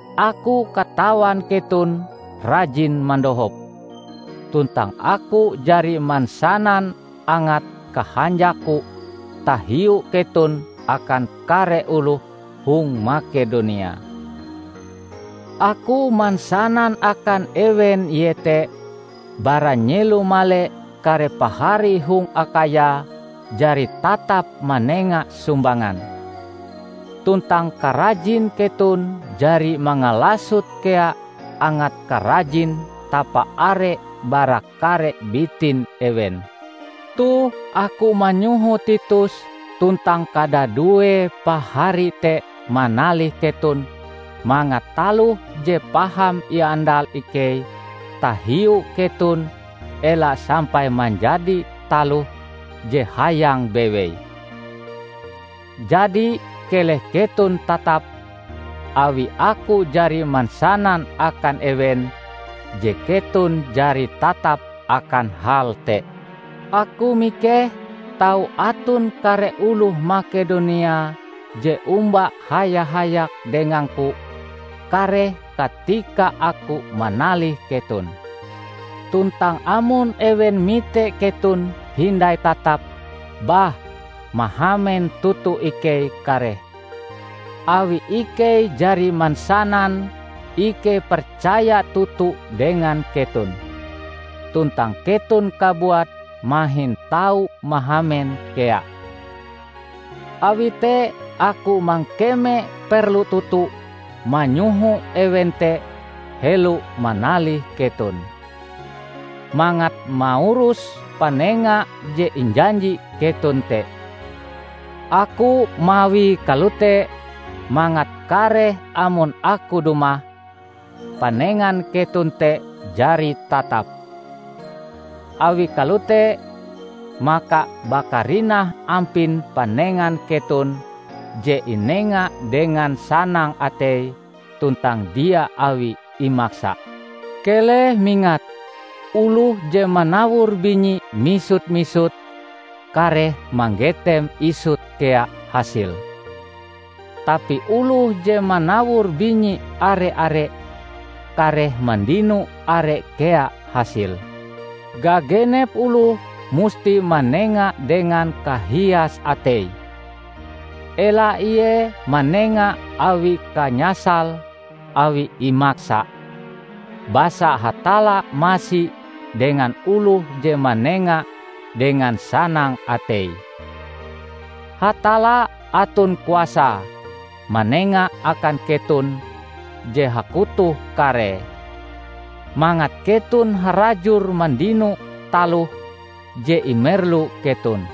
Aku katawan keton rajin mandohop, tuntang aku jari mansanan angat kahanjakku tahiu keton akan kare oloh hong Makedonia. Aku mansanan akan ewen iete, bara nyelo male kare pahari hong Akhaya jari tatap manenga sumbangan. Tuntang karajin keton jari mangalasot kea angat karajin tapaare bara kare bitin ewen. Toh aku manyoho Titus tuntang kadadue pahari te manalih keton mangat taloh je paham iandal ikei tahiu keton ela sampai manjadi taloh je hayang bewei. Jadi keleh keton tatap, awi aku jari mansanan akan ewen je keton jari tatap akan hal te. Aku mikeh, tau aton kare oloh Makedonia je omba haya-hayak dengangku kareh katika aku manalih keton. Tuntang amon ewen mite keton hindai tatap, bah, mahamen toto ikei kareh, awi ikei jari mansanan ikei percaya toto dengan keton! Tuntang keton kabuat mahin tau mahamen kea. Awi te aku mangkeme perlu toto manyoho ewen te helo manalih keton, mangat maurus panenga je injanji keton te. Aku mawie kalote mangat kareh amon aku dumah, panengan keton te jari tatap. Awi kalote, maka bakarinah ampin panengan keton je inenga dengan sanang atei, tuntang dia awi imaksa. Keleh mingat! Oloh je manawor binyi misut-misut kareh manggetem isut kea hasile. Tapi oloh je manawor binyi are-are, kareh mandino are kea hasile. Gagenep oloh musti manenga dengan kahias ateie. Ela ie manenga awi kanyasale awi imaksa, basa Hatalla masi dengan oloh je manenga dengan sanang ateie. Hatalla aton kuasae manenga akan keton je hakotoh karee, mangat keton harajur mandino taloh je imerlu keton;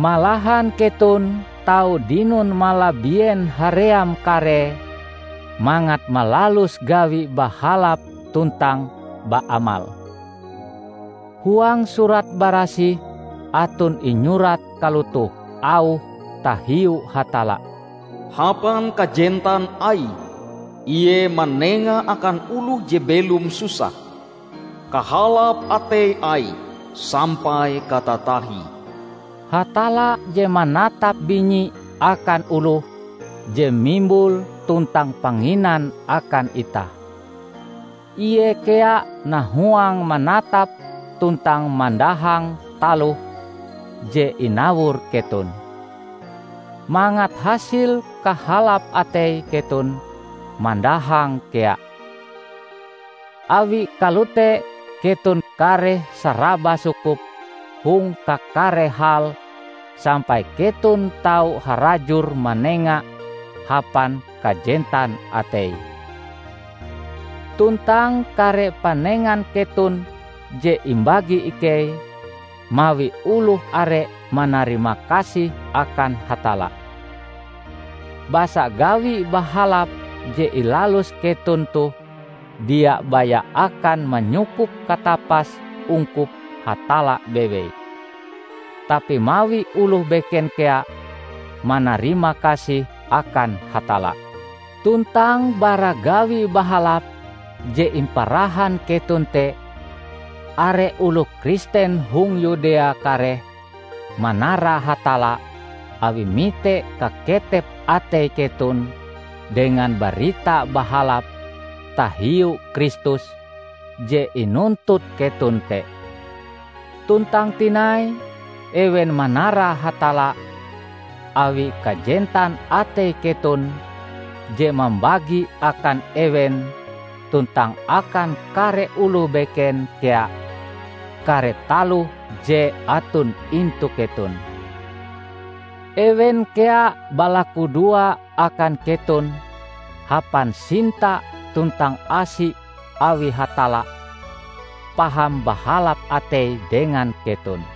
malahan keton tau dinon malabien haream karee mangat malalus gawi bahalap tuntang baamal. Huang Surat Barasih aton inyurat kalotoh auhe tahiu Hatalla, "Hapan kajentan Aie Ie manenga akan oloh je belom susah; kahalap atei Aie sampai katatahie." Hatalla je manatap binyi akan oloh je mimbul tuntang panginan akan itah. Ie kea nahuang manatap tuntang mandahang taloh je inawor keton, mangat hasil kahalap atei keton mandahang kea. Awi kalote keton kareh saraba sukup hong kakare hal sampai keton tau harajur manenga hapan kajentan atei. Tuntang kare panengan keton je imbagi ikei, mawi oloh are manarimakasih akan Hatalla. Basa gawi bahalap je ilalus keton toh dia baya akan manyukup katapas ungkup Hatalla bewei, tapi mawi oloh beken kea manarimakasih akan Hatalla. Tuntang bara gawi bahalap je imparahan keton te, are oloh Kristen hong Yudea kareh manara Hatalla awi mite kaketep atei keton dengan Barita Bahalap tahiu Kristus je inuntut keton te. Tuntang tinai, ewen manara Hatalla, awi kajentan atei keton je mambagi akan ewen tuntang akan kare oloh beken kea kare taloh je aton intu keton. Ewen kea balakudoa akan keton hapan sinta tuntang asi awi Hatalla paham bahalap atei dengan keton.